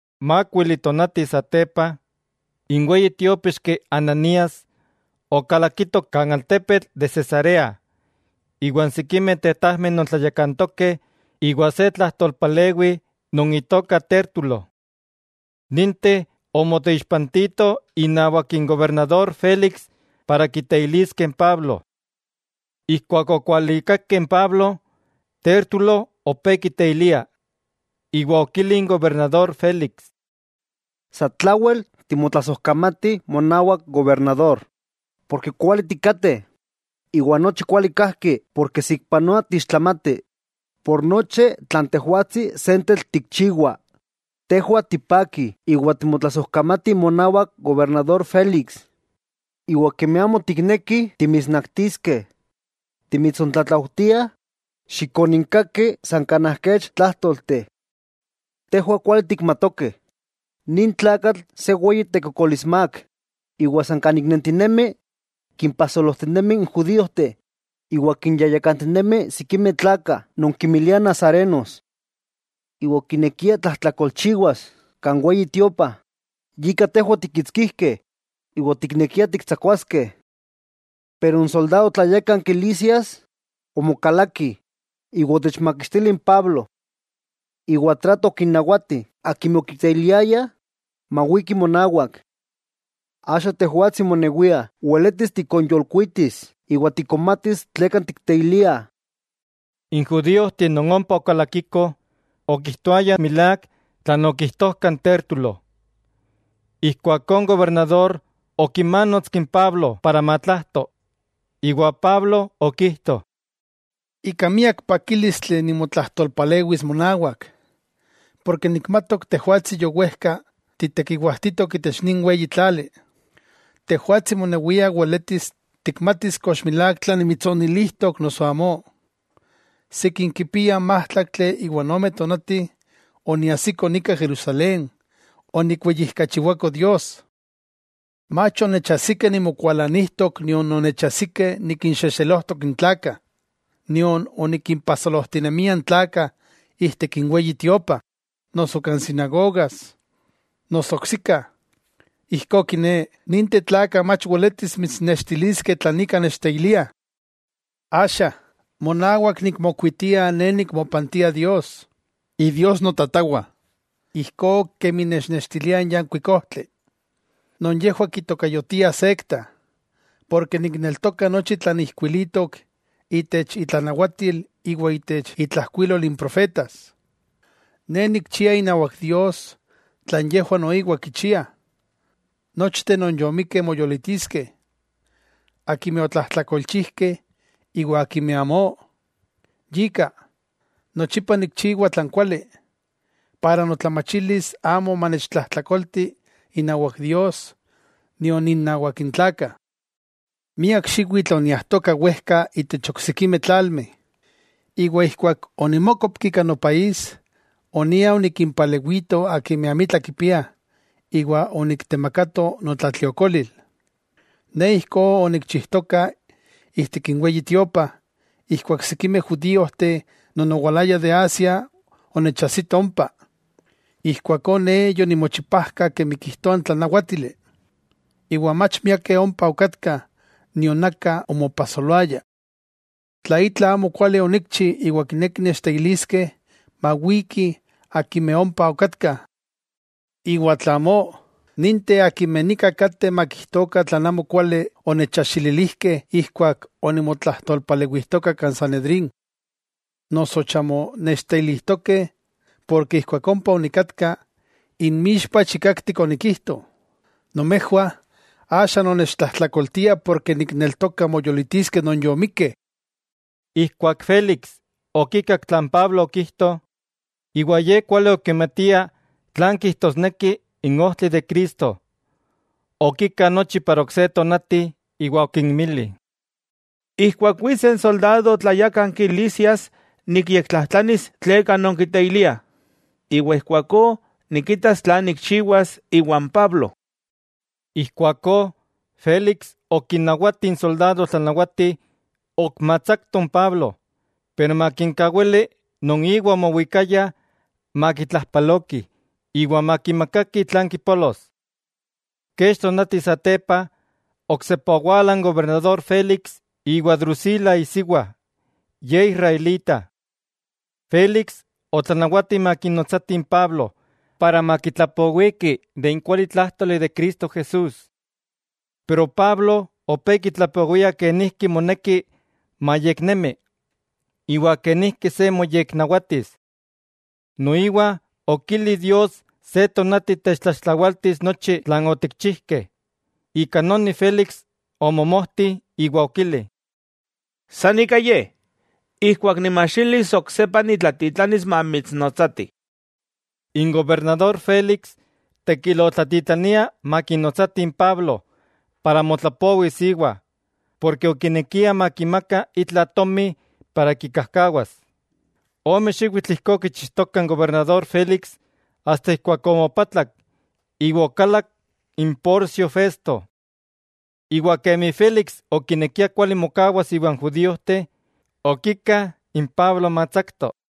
Mákuili tonati satepa, n weyi tiópixki Ananías, okalakito kan altepetl de Cesarea iwa n sikimeh tetajmeh non tlayakantokeh iwa se tlajtolpalewi non itoka Tértulo. Ninteh omoteixpantitoh inawak n gobernador Félix para kiteiliskeh n Pablo. Ijkuak okualikakeh n Pablo, Tértulo opé kiteilia, iwa okili n gobernador Félix: —Satlawel timotlasojkamatih monawak gobernador, porke kuali tikateh, iwa nochi kuali kajki porke saikpanoa tiixtlamati. Por nochi tlan tejwatsi sentetl tikchiwa, tejwah tipakih iwa timotlasojkamatih monawak gobernador Félix. Iwa kemi amo tiknekih timitsnaktiskeh, timitsontlatlaujtiah xikoninkaki san kanaj kech tlájtolteh. Tejwah kuali tikmatokeh nin tlakatl se weyi tekokolismák, iwa san kan ik nentinemi kinpajsolojtinemi n judíojteh; iwa kinyayakantinemi sikimeh tlakah non kinmiliah nazarenos. Iwa okinekia tlajtlakolchiwas kan Weyi Tiopa, yika tejwah otikkitskijkeh iwa otiknekiah tiktsakuaskeh. Pero n soldado tlayákanki Lisias omokalaki iwa otechmakixtili n Pablo. Iwa trato okinnawati akimeh okiteiliayah mawikih monawak. Axa tejwatsi monewia weletis tikonyolkuitis iwa tikonmatis tleka tikteiliah. N judíojteh non ompa okalakikoh, okijtoayah milák tlan okijtojtoka n Tértulo. Ijkuakó n gobernador okimanotski n Pablo para matlajto, iwa Pablo okijto: —Ika miak pakílistli nimotlajtolpalewis monawak, porke nikmatok tejwatsi yowejka titekiwajtitok itech nin weyi tlali. Tejwatsi monewia weletis tikmatis kox milák tlan nimitsonilijtok noso amó, sikin kipia májtlaktli iwa ome tonati oniajsiko nika Jerusalén onikweyijkachiwako Dios. Mach onechajsikeh nimokualanijtok nion onechajsikeh nikinxexelojtok n tlakah, nion onikimpajsolojtinemia n tlakah ijtik n Weyi Tiopa, noso kan sinagogas, noso oksika. Ijkó kiné, ninteh tlakah mach weletis mitsnextiliskeh tlan ika nechteiliah. Axa, monawak nikmokuitia ne nikmopantia Dios, Idios notatawah ijkó kemi nechnextilia n yankuik ojtli, non yejwah kitokayotiah sekta, porke nikneltoka nochi tlan ijkuilitok itech itlanawatil iwa itech intlajkuilol n profetas. Ne nikchia inawak Dios tlan yejwah noiwa kichiah, nochteh non yomikkeh moyolitiskeh, akimeh otlájtlakolchijkeh iwa akimeh amó. Yika, nochipa nikchiwa tlan kuali, para notlamachilis amo manechtlajtlakolti inawak Dios nion innawak n tlakah. 'Miak xiwitl oniajtoka wejka itech oksikimeh tlalmeh, iwa ijkuak onimókopki kan nopaís, onia onikimpalewito akimeh amitla kipiah iwa oniktemakato notlatliokolil. Ne ijkó onikchijtoka ijtik n Weyi Tiopa ijkuak sikimeh judíojteh non owalayah de Asia onechajsitoh ompa. Ijkuakó ne yonimochipajka kemi kijtoa n tlanawátili, iwa mach miakeh ompa okatkah nion aka omopajsoloaya. Tla itla amokuali onikchi iwa kinekih nechteiliskeh, mawikih akimeh ompa okatkah. Iwa tla amó, ninteh akimeh nika kateh makijtokah tlan amokuali onechajxililijkeh ijkuak onimotlajtolpalewijtoka kan Sanedrín. Noso chamo nechteilijtokeh porke ijkuak ompa onikatka, inmixpa chikaktik onikijto: “Nomejwah axa nonnechtlajtlakoltiah porke nikneltoka moyolitiskeh non yomikkeh.” Ijkuak Félix okikak tlan Pablo okijto, iwa ye kuali okimatia tlan kijtosneki n ojtli de Cristo, okika nochi para ok se tonati iwa okinmili: —Ijkuak wits n soldado tlayákanki Lisias nikyektlajtlanis tleka nonkiteiliah, iwa ijkuakó nikitas tlan nikchiwas iwan Pablo. Ijkuakó Félix okinawati n soldado tlanawati ok matsakto n Pablo, pero makinkawili non iwa omowikaya makitlajpalokih iwa makimakakih tlan kipolos. Kech tonati satepa, oksepa owala n gobernador Félix iwa Drusila isiwa, ye israelita. Félix otlanawati makinotsatih n Pablo para makitlapowiki de n kualitlájtoli de Cristo Jesús. Pablo opé kitlapowia kenijki moneki mayeknemi, iwa kenijki se moyeknawatis. Noiwa okili Dios se tonati techtlaxtlawaltis nochi tlan otikchijkeh, ika noni Félix omomojti iwa okili: —San ika ye. Ijkuak nimajxilis oksepa nitlatitlanis mamitsnotsatih. N gobernador Félix tekil otlatitlania makinotsatih n Pablo para motlapowis íwa, porke okinekia makimaka itla tomi para kikajkawas. Ome xiwitl ijkó okichijtoka n gobernador Félix asta ijkuak omopatlak iwa okalak n Porcio Festo. Iwa kemi Félix okinekia kuali mokawas iwan judíojteh, okika n Pablo matsakto.